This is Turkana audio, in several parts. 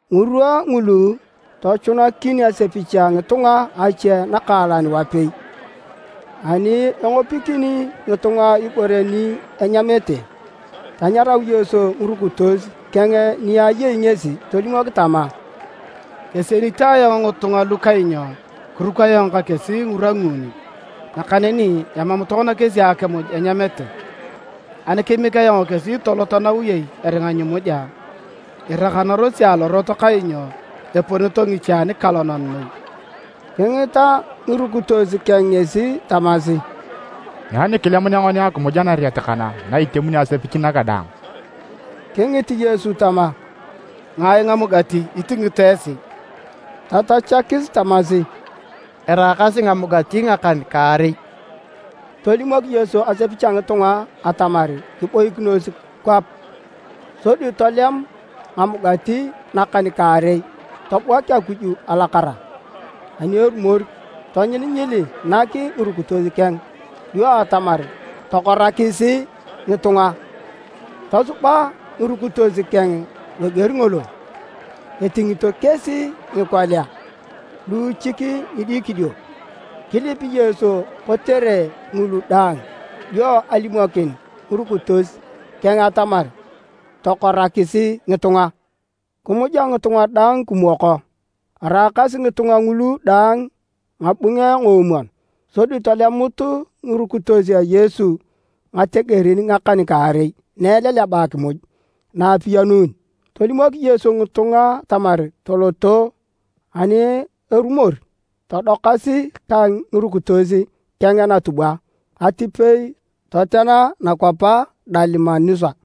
Ngirwa ngulu, tochunakin asepich a ngitunga ache nakaalan wapei. Ani engopokini ngitunga ibore ni enyamete, tanyarau Yesu ngirukitos keng ni ayei ngesi tolimok tama, “Kesienito ayong ngitunga lu kainyo kiruk ayong ka kesi ngirwa nguuni, nakaneni emam tokona kesi akimuj enyamete. Ani kemiek ayong kesi toloto nawiyei eringa nyimuja, irakanarosi alorot kainyo eponito ngiche anikalonan noi.” Kingita ngirukitos keng ngesi tamasi, “Nyai nikilemunea ngoni akimuj anariet kana na itemokin asepich naga daang?” Kingit Yesu tama, “Ngai ngamugati itingito esi?” Tatachakis tamasi, “Eraakasi ngamugati ngakan-kaarei.” Tolimok Yesu asepich a ngitunga atamar kiboikinos kwap. Sodi tolem ngamugati nakan-kaarei tobuak Akuj alakara. Ani erumor tonyilinyili nak ngirukitos keng dio atamar tokorakis ngitunga. Tosuba ngirukitos keng loger ngolo. Atingito kesi ngikolia luuchik ngidikidio. Kilip Yesu kotere ngulu dang dio alimokin ngirukitos keng atamar tokorakis ngitunga. Kimuja ngitunga daang kimwoko, araakasi ngitunga ngulu daang ngabunge ngoomwon. Sodi tolemut ngirukitos a Yesu ngategerin ngakan-kaarei na eleleba akimuj na apiyanun. Tolimok Yesu ngitunga atamar toloto ani erumor todokasi ka ngirukitos keng natubwa atipei totena nakwap a Dalimanusa.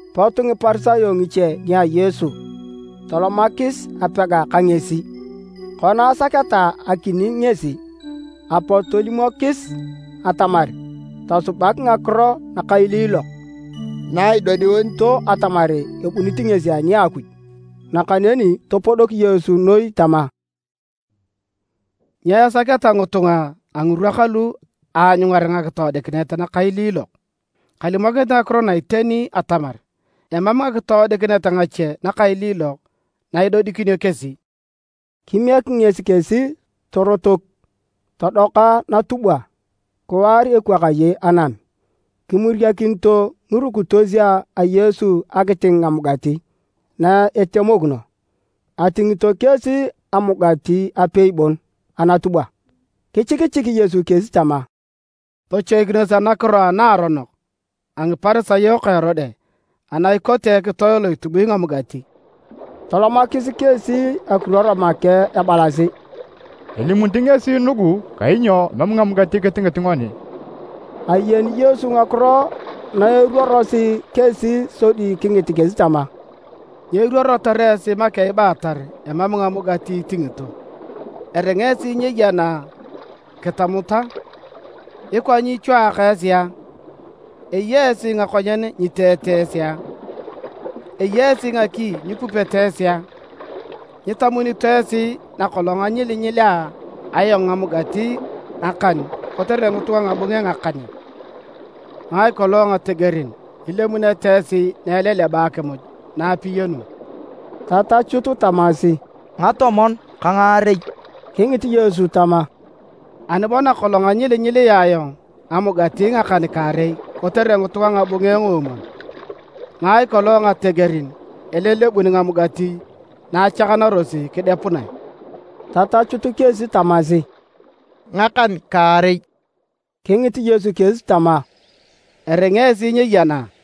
Pot Ngiparisayo ngiche nia Yesu tolomakis apega ka ngesi. Kona asaketa akining ngesi, apot tolimokis atamar, tosubak ngakiro nakailiilok na idodiunito atamar ebunit ngesi ani a Akuj. Nakaneni topodok Yesu noi tama, “Nyo esaketa ngitunga a ngirwa kalu aanyungar ngakitoodikinet nakailiilok? Kalimokinit ngakiro na iteni atamar emam ngakitoodikinet ngache nakailiilok na idodikinio kesi!” Kimiek ngesi kesi, torotok todoka natubwa kiwaar ekwakaye anam. Kimuriakinito ngirukitos a Yesu akiting ngamugati na itemokino. Atingito kesi amugati apei bon anatubwa. Kichikichik Yesu kesi tama, “Tochoikinos anakiro anaaronok a Ngiparisayo ka Erode ana ikote ekitoe lo itubui ngamugati.” Tolomakis kesi ekiruor make ebalasi: “Elimunit ngesi nugu kainyo emam ngamugati kitingit ngoni.” Ayeni Yesu ngakiro na eruorosi kesi sodi kingit kesi tama, “Nyo iruorotor esi make ibaatar emam ngamugati itingito? Eringa esi nyeyena kitamut a? Ikwa nyichwaaka esi a? Eya esi ngakonyen nyiteete esi a? Eya esi ngaki nyipupete esi a? Nyitamunito esi nakolong anyilinyilea ayong ngamugati ngakan kotere ngitunga ngabunge ngakan a? Ngai kolong ngategerin ilemunete esi na eleleba akimuj na apiyanun?” Tatachut tamasi, “Ngatomon ka ngaarei.” Kingit Yesu tama, “Ani bo nakolong anyilinyilea ayong ngamugati ngakan-kaarei kotere ngitunga ngabunge ngoomwon. Ngai kolong ngategerin elelebun ngamugati na achakanarosi kidepunae?” Tatachut kesi tamasi, “Ngakan-kaarei.” Kingit Yesu kesi tama, “Eringa esi nyeyena a?”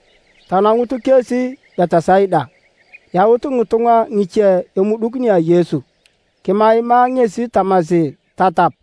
Tanangut kesi Betisaida. Yaut ngitunga ngiche emuduk nia Yesu kimaima ngesi tamasi tatap.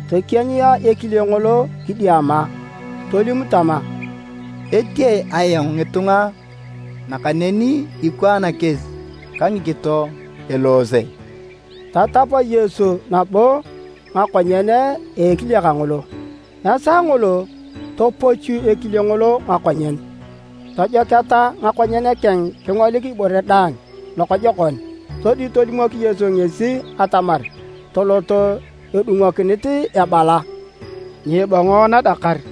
Tokienyia ekile ngolo kidiama tolim tama, “Etee ayong ngitunga nakaneni ikwaan kesi ka ngikito eloose.” Tatap Yesu nabo ngakonyen a ekile kangolo. Esaa ngolo topochu ekile ngolo ngakonyen. Tojoketa ngakonyen keng kingolik ibore daang lokojokon. Sodi tolimok Yesu ngesi atamar tolot edungokinit ebala, “Nyiibongo nadakar.”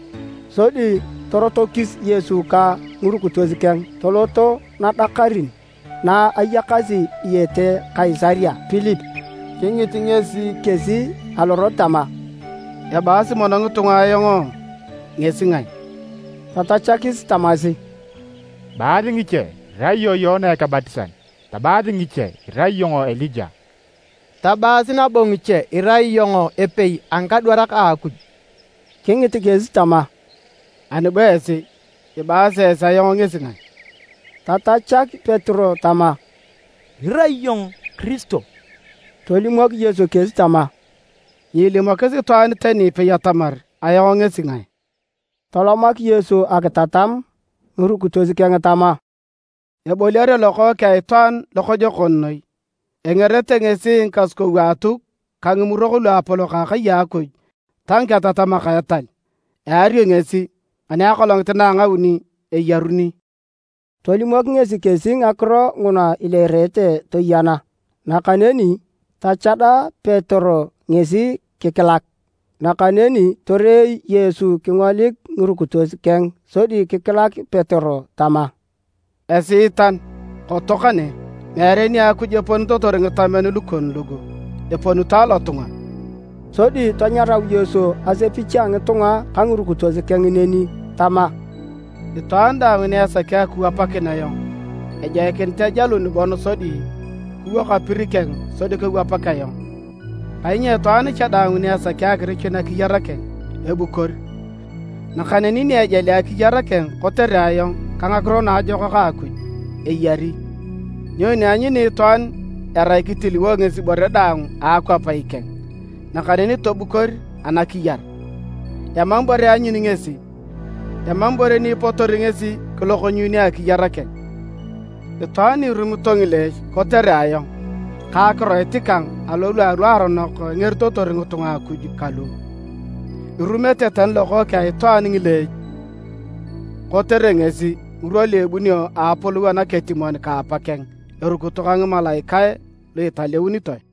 Sodi torotokis Yesu ka ngirukitos keng toloto nadakarin na ayakasi diyete Kaisaria Pilipi. Kingit ngesi kesi alorot tama, “Ebaasi mono ngitunga ayong ngesi ngae?” Tatachakis tamasi, “Ebaasi ngiche irai iyong Yoana Ekebatisan. Tabaas ngiche irai iyong Elija. Tabaas nabo ngiche irai iyong epei a ngikadwarak a Akuj.” Kingit kesi tama, “Ani bo esi. Ibaasi esi ayong ngesi ngae?” Tatachak Petero tama, “Irai iyong Kiristo.” Tolimok Yesu kesi tama, “Nyiilimokis itwaan tani ipei atamar ayong ngesi ngae.” Tolomak Yesu akitatam ngirukitos keng tama: “Eboliare Lokookeng a Itwaan lokojokon noi. Engerete ngesi Ngikasukou a Atuk ka Ngimurok Luapolok a akai a Akuj ta ngiketatamak a etal. Eario ngesi, ani akolongit na a ngauni eyaruni.” Tolimok ngesi kesi ngakiro nguna ileerete toyena. Nakaneni tachada Petero ngesi kikilak. Nakaneni torei Yesu kingolik ngirukitos keng sodi kikilak Petero tama, “Esiitan, koto kane. Meere nia Akuj eponitotor ngitamen lukon lugu, eponito alotunga!” Sodi tanyarau Yesu asepich a ngitunga ka ngirukitos keng neni tama, “Itwaan daang ni esaki akiwapakin ayong, ejoikinit ejalun bon sodi kiwok apir keng sodi kewapak ayong. Kainyo itwaan cha daang ni esaki akirichun akiyar keng, ebukor, nakaneni ni ejali akiyar keng kotere ayong ka ngakiro naajokak a Akuj, eyari. Nyoni eanyuni itwaan erai kitiliwo ngesi ibore daang a akwap ikeng, nakaneni tobukor anakiyar? Emam ibore eanyuni ngesi! Emam ibore ni ipotori ngesi kilokonyuunio akiyar keng. Itwaan ni irumito ngileech kotere ayong ka akiroit kang alorwa aluaronok engeritotor ngitunga Akuj kalu, irumete tani Lokookeng a Itwaan ngileech kotere ngesi ngirwa lu ebunio a Apolou anaketimon ka Apakeng erukito ka ngimalaikae lu italeunitoe.”